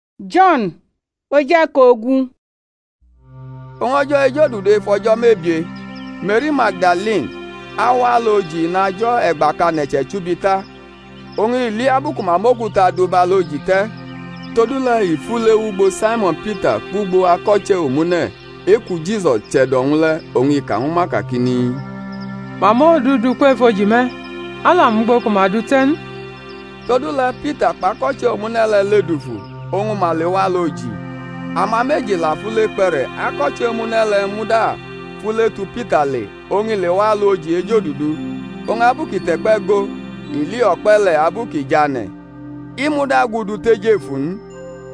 Efu oji le̩ te̩ ofo! Oñ o̩jo̩ ejodudu ef o̩jo̩ mebie Me̩ri Magdalini, awa alu oji inajo̩ e̩gba kʼane̩ che̩chubi ta, oñ i li abu ku ma mʼokuta du bʼalu oji te̩. Todule̩ i fule wʼugbo Saimo̩n Pita kpʼugbo ako̩che̩ omune̩ e-ku Jisus che̩do̩-wñ le̩, oñ i ka ñwu ma kakini, Ma mʼOndu du kwef oji me̩, a la mʼugbo ku ma dʼu te̩ n. Todule̩ Pita kpʼakoche̩ omune̩ le̩ ledufu, oñ ma lewʼalu oji. Ama meji la fule kpe̩re̩, ako̩che̩ omune̩ le̩ muda fule tu Pita le, oñ i lewa alu oji ejodudu. Oñ abu kʼi te̩kpe̩ go, i li o̩kpe̩ le̩ abu kʼi jʼane̩; i muda gudu tejefu n.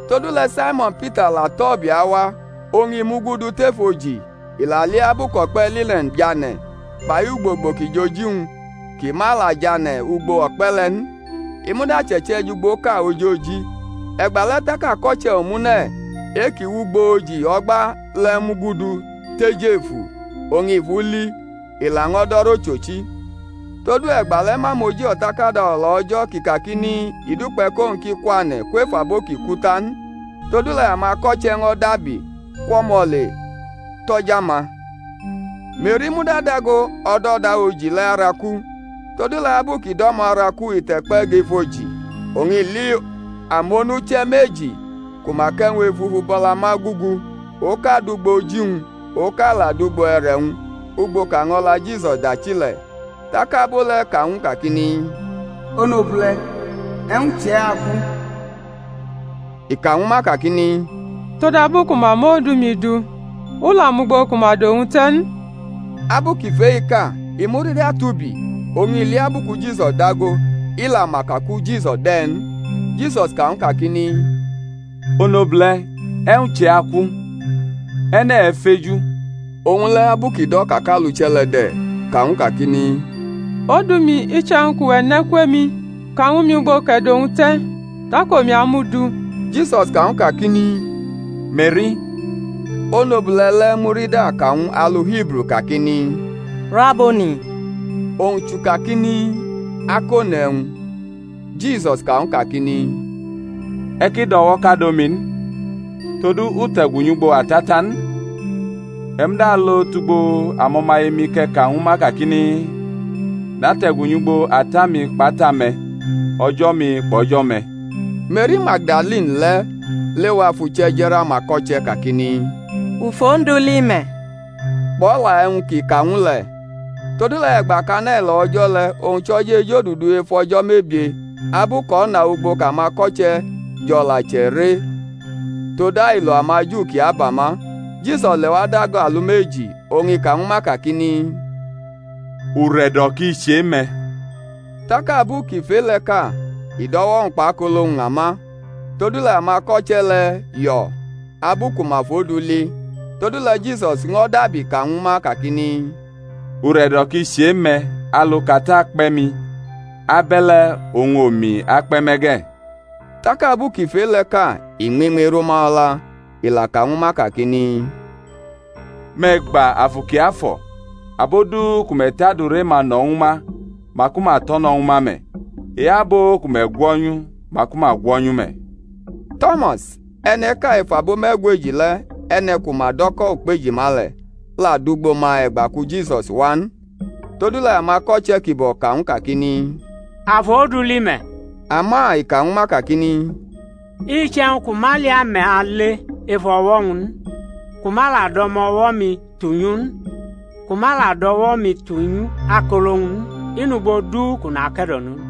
Todule̩ Saimo̩n Pita la tʼo̩ ubi awa, oñ i mugudu tef oji, i la li abu kʼo̩kpe̩ line̩n tʼane̩ kpai ugbogbo ki jʼoji-wñ, kʼi ma la tʼane̩ ugbo o̩kpe̩ le̩ n, i muda chʼe̩che̩ jʼugboʼka ojoji. E̩gbale̩ tak ako̩che̩ omune̩ e-kʼi wʼugbo oji o̩gba le̩ mugudu tejefu, oñ i fʼu li, i laño̩ do̩rʼochochi. Todu e̩gbale̩ ma mʼoji O̩takada O̩la O̩jo̩ kʼi kakini, I dukpe̩ kʼowñ ki kwane̩ kwef abo ki ku, ta n. Todule̩ amako̩che̩ ño̩ dabi kwʼo̩mo̩ le tʼo̩ja-ma. Me̩ri muda dago o̩do̩da oji le̩ araku. Todule̩ abu kʼi do̩mo̩ araku i te̩kpe̩ gʼef oji, oñ i li amonuche̩ meji ku ma kʼe̩wñ efufu bʼo̩la ma gugu, oka dʼugbo oji-wñ, oka la dʼugbo e̩re̩-wñ ugbo kʼaño̩la Jisus dachi le̩. Tak abo le̩ ka ñw u kakini, Onobule̩, e̩wñ chʼe̩ aku? I ka ñwu ma kakini, Todabu ku ma mʼOndu-mi du, u la mʼugbo ku ma dʼowñ te̩ n. Abu kʼi fʼe-i ka i murida tubi, oñ i li abu ku Jisus dago, i la ma ka ku Jisusi de̩ n. Jisus ka ñw u kakini, Onobule̩, e̩wñ chʼe̩ aku? E̩ne̩ e̩feju? Owñ le̩, abu kʼi do̩ ka kʼaluche̩ le̩ de̩, ka ñw u kakini, Odu-mi, iche̩wñ kʼuwe̩ nʼe̩ kwʼemi, ka ñwu mi ugbo kʼe̩ dʼowñ te̩, tak omi amʼu du. Jisus ka ñw u kakini, Me̩ri! Onobule̩ le̩ murida ka ñw u alu Hibru kakini, Raboni, (owñ chʼukakini. Akone̩wñ). Jisus ka ñw u kakini, E̩ ki do̩wo̩kado mi n, todu u te̩gu nyʼugbo Ata ta n; e̩ muda alo tʼugbo amo̩maye-mi kʼe̩ ka ñwu ma kakini, Nate̩gu nyʼugbo Ata-mi kpʼAta-me̩, O̩jo̩-mi kpʼO̩jo̩-me̩. Me̩ri Magdalini le̩ lewa fʼuche̩ je̩rʼamako̩che̩ kakini, U fʼOndu li me̩, kpʼo̩la e̩wñ kʼi ka ñw u le̩. Todule̩ e̩gba kʼane̩ lo̩ o̩jo̩ le̩, owñ chʼo̩jo̩ ejodudu ef o̩jo̩ mebie abu kʼo̩na ugbo kʼamako̩che̩ jo̩ la chʼe̩re tod ailo amaJu ki aba ma, Jisus lewa dago alumeji, oñ i ka ñwu ma kakini, Ure̩do̩ ki chʼe-me̩. Tak abu kʼi fʼe-le̩ ka, i dʼo̩wo̩-wñ kpʼakolo-wñ ña ma. Todule̩ amako̩che̩ le̩ yo̩ abu ku ma fʼOndu li. Todule̩ Jisus ño̩ dabi ka ñwu ma kakini, Ure̩do̩ ki chʼe-me̩; alu kʼAta kpe̩ mi, abe̩le̩ oñ omi akpe̩ me̩ ge̩. Tak abu kʼi fʼe-le̩ ka i ñmiñmi rʼuma o̩la, i la ka ñwu ma kakini, Me̩ gba Afu Kiafo̩: abo du ku me̩ tʼadure-ma no̩ ñwu ma, maku ma tʼo̩ no̩ ñwu ma me̩; e-abo ku me̩ gwo̩nyu maku ma gwo̩nyʼu me̩. To̩mas, e̩ne̩ʼka ef abo me̩gweji le̩, e̩ne̩ ku ma do̩ ko̩ Ukpejima le̩, la dʼugbo ma e̩gba ku Jisus wa n. Todule̩ amako̩che̩ kibo̩ ka ñw u kakini, A fʼOndu li me̩. Ama i ka ñwu ma kakini, Iche̩wñ kʼu ma li ame̩ ale ef o̩wo̩-wñ n, kʼu ma la dʼo̩mo̩wʼo̩-mi tunyʼu n; ku ma la dʼo̩wo̩-mi tunyʼakolo-wñ n, i nugbo du kʼu nake̩do̩no n.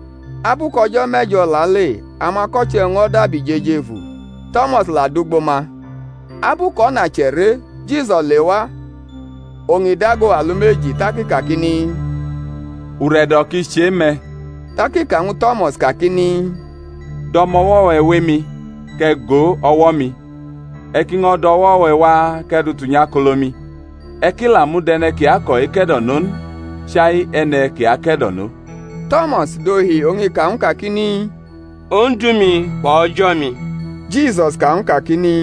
Abu kʼo̩jo̩ me̩jo̩ lale amako̩che̩-wñ ño̩ dabi jʼejefu. Tomas la dʼugbo ma. Abu kʼo̩na chʼe̩re Jisus lewa oñ i dago alumeji, tak i kakini, Ure̩do̩ ki chʼe-me̩. Tak i ka ñwu To̩mas kakini, Dʼo̩mo̩wo̩-we̩ wʼemi, kʼe̩ go o̩wo̩-mi; e̩ ki ño̩ dʼo̩wo̩-we̩ wa kʼe̩ dʼu tunyʼakolo-mi; e̩ ki la mud e̩ne̩ ki ako̩ eke̩do̩no n, chai e̩ne̩ ki ake̩do̩no. To̩mas dohi oñ i ka ñw u kakini, Ondu-mi kpʼO̩jo̩-mi. Jisus ka ñw u kakini,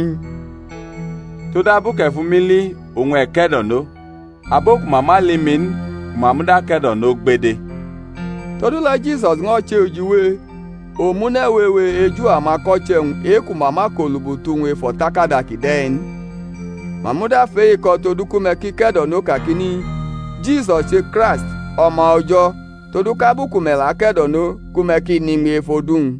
Todabu kʼe̩ fʼumi li oñ e̩ ke̩do̩no; abo ku ma ma li mi n, ku ma muda ke̩do̩no gbede. Todule̩ Jisus ño̩ che ujiwe omune̩ wewe eju amako̩che̩-wñ e-ku ma ma kʼolubutu-wñ ef o̩takada kide̩-i n; ma muda fʼe-i ko̩ todu ku me̩ ki ke̩do̩no kakini, Jisus che Kraist O̩ma O̩jo̩, todu kʼabu ku me̩ la ke̩do̩no ku me̩ ki nʼiñmi ef odu-wñ.